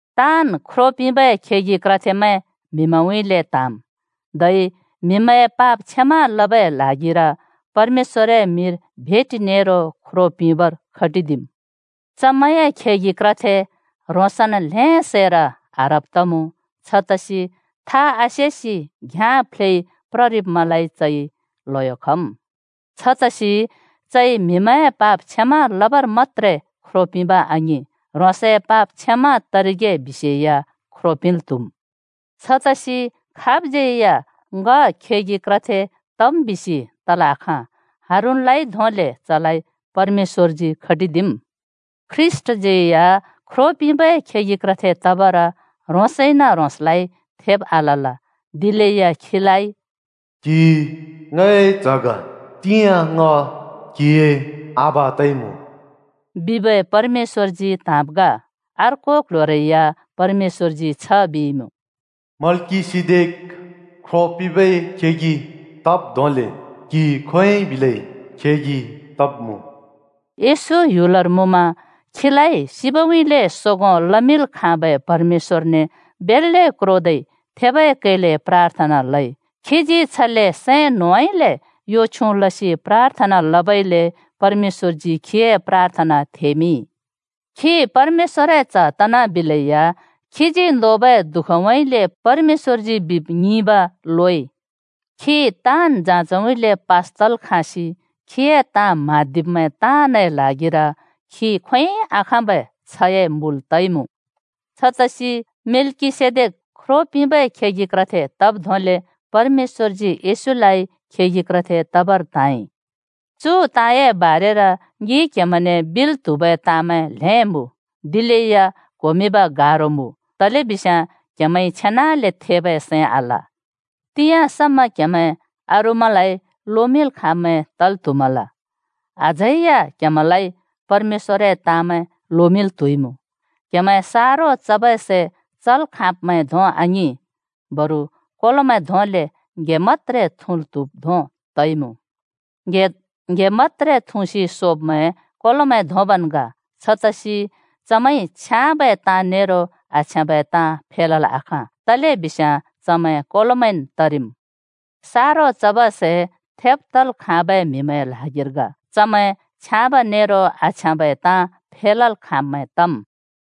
ताँन् ख्रो पिंबै खेगि क्रथेमैं म्‍हिमैंउँइँले त्‍हाँम्, धै म्हिमैंए पाप क्षमा लबै ल्हागिर परमेश्‍वरए मिंर भेटि नेरो ख्रो पिंबर खटिदिम्। चमैंए खेगि क्रथे ह्रोंसन् ल्‍हें सैर आह्रब् तमुँ, छतसि था आसेसि घ्याँ फ्लेइ प्ररिब्मैंलाइ चइ ल्‍हयो खम्। छतसि चइ म्हिमैंए पाप क्षमा लबर मत्‍त्रे ख्रो पिंब आङिं, ह्रोंसए पाप क्षमा तरिगे बिसेया ख्रो पिंल् त्‍हुम्। छतसि खाबज्‍यै या ङ खेगि क्रथे तम् बिसि तल् आखाँ, हारूनलाइ धोंले चलाइ परमेश्‍वरजी खटिदिम्। ख्रीष्‍टज्यै या ख्रो पिंबै खेगि क्रथे तबर ह्रोंसइन-ह्रोंसलाइ थेब आलल, दिलेया खीलाइ “क्हि ङए च्‍ह ग, तिंयाँ ङ क्‍हिए आबा तइमुँ,” बिबै परमेश्‍वरजी त्हाँब् ग। अर्को क्‍ल्‍ह्‍योरै या परमेश्‍वरजी छ बिइमुँ, “मल्‍किसेदेक ख्रो पिंबै खेगि तब् धोंले क्हि खोंयोंइ बिलै खेगि तब्‍मुँ।” येशू ह्‍युलर मुँमा खीलाइ सिबउँइँले सोगों लमिंल् खाँबै परमेश्‍वरने बेल्‍ले क्रोदै थेबै कैले प्राथना लइ। खीजी छले सैं न्होंउँइँले यो छ्युँ लसि प्राथना लबइले परमेश्‍वरजी खीए प्राथना थेमिंइ। खी परमेश्‍वरए च्‍ह तनाबिलेया खीजी नोबै दुःखउँइँले परमेश्‍वरजी बिब ङिंब लोइ। खी ताँन् जाँचउँइँले पास तल् खाँसि खीए ताँ म्हाँदिब्‍मैं ताँनए ल्हागिर खी खोंयोंइ आखाँबै छ्हए मुल तइमुँ। छतसि मेल्‍किसेदेक ख्रो पिंबै खेगि क्रथे तब् धोंले परमेश्‍वरजी येशूलाइ खेगि क्रथे तबर त्हाँइ। चु ताँए बारेर ङिइ क्‍हेमैंने बिल् त्हुबै ताँमैं ल्‍हें मुँ, दिलेया क्‍होमिंब गारो मुँ, तलेबिस्याँ क्हेमैंइ छेनाले थेबै सैं आल। तिंयाँ समा क्‍हेमैं अरूमैंलाइ लोमिंल् खाँब्मैं तल् त्‍हुमल, अझै या क्हेमैंलाइ परमेश‍वरए ताँमैं लोमिंल् त्‍हुइमुँ। क्‍हेमैं सारो चबै सै चल् खाँब्मैं धों आङिं, बरु कोलोमैं धोंले ङ्‌हे मत्‍त्रे थुँल् त्‍हुब् धों तइमुँ। ङ्‌हे मत्‍त्रे थुँसि सोब्मैं कोलोमैं धोंबन् ग, छतसि चमैंइ छ्याँबै ताँ नेरो आछ्याँबै ताँ फेलल् आखाँ, तलेबिस्याँ चमैं कोलोमैंन् तरिम्। सारो चबै सै थेब् तल् खाँबै म्‍हिमैंए ल्हागिर ग। चमैं छ्याँब नेरो आछ्याँबै ताँ फेलल् खाँम्‍मैं तम्।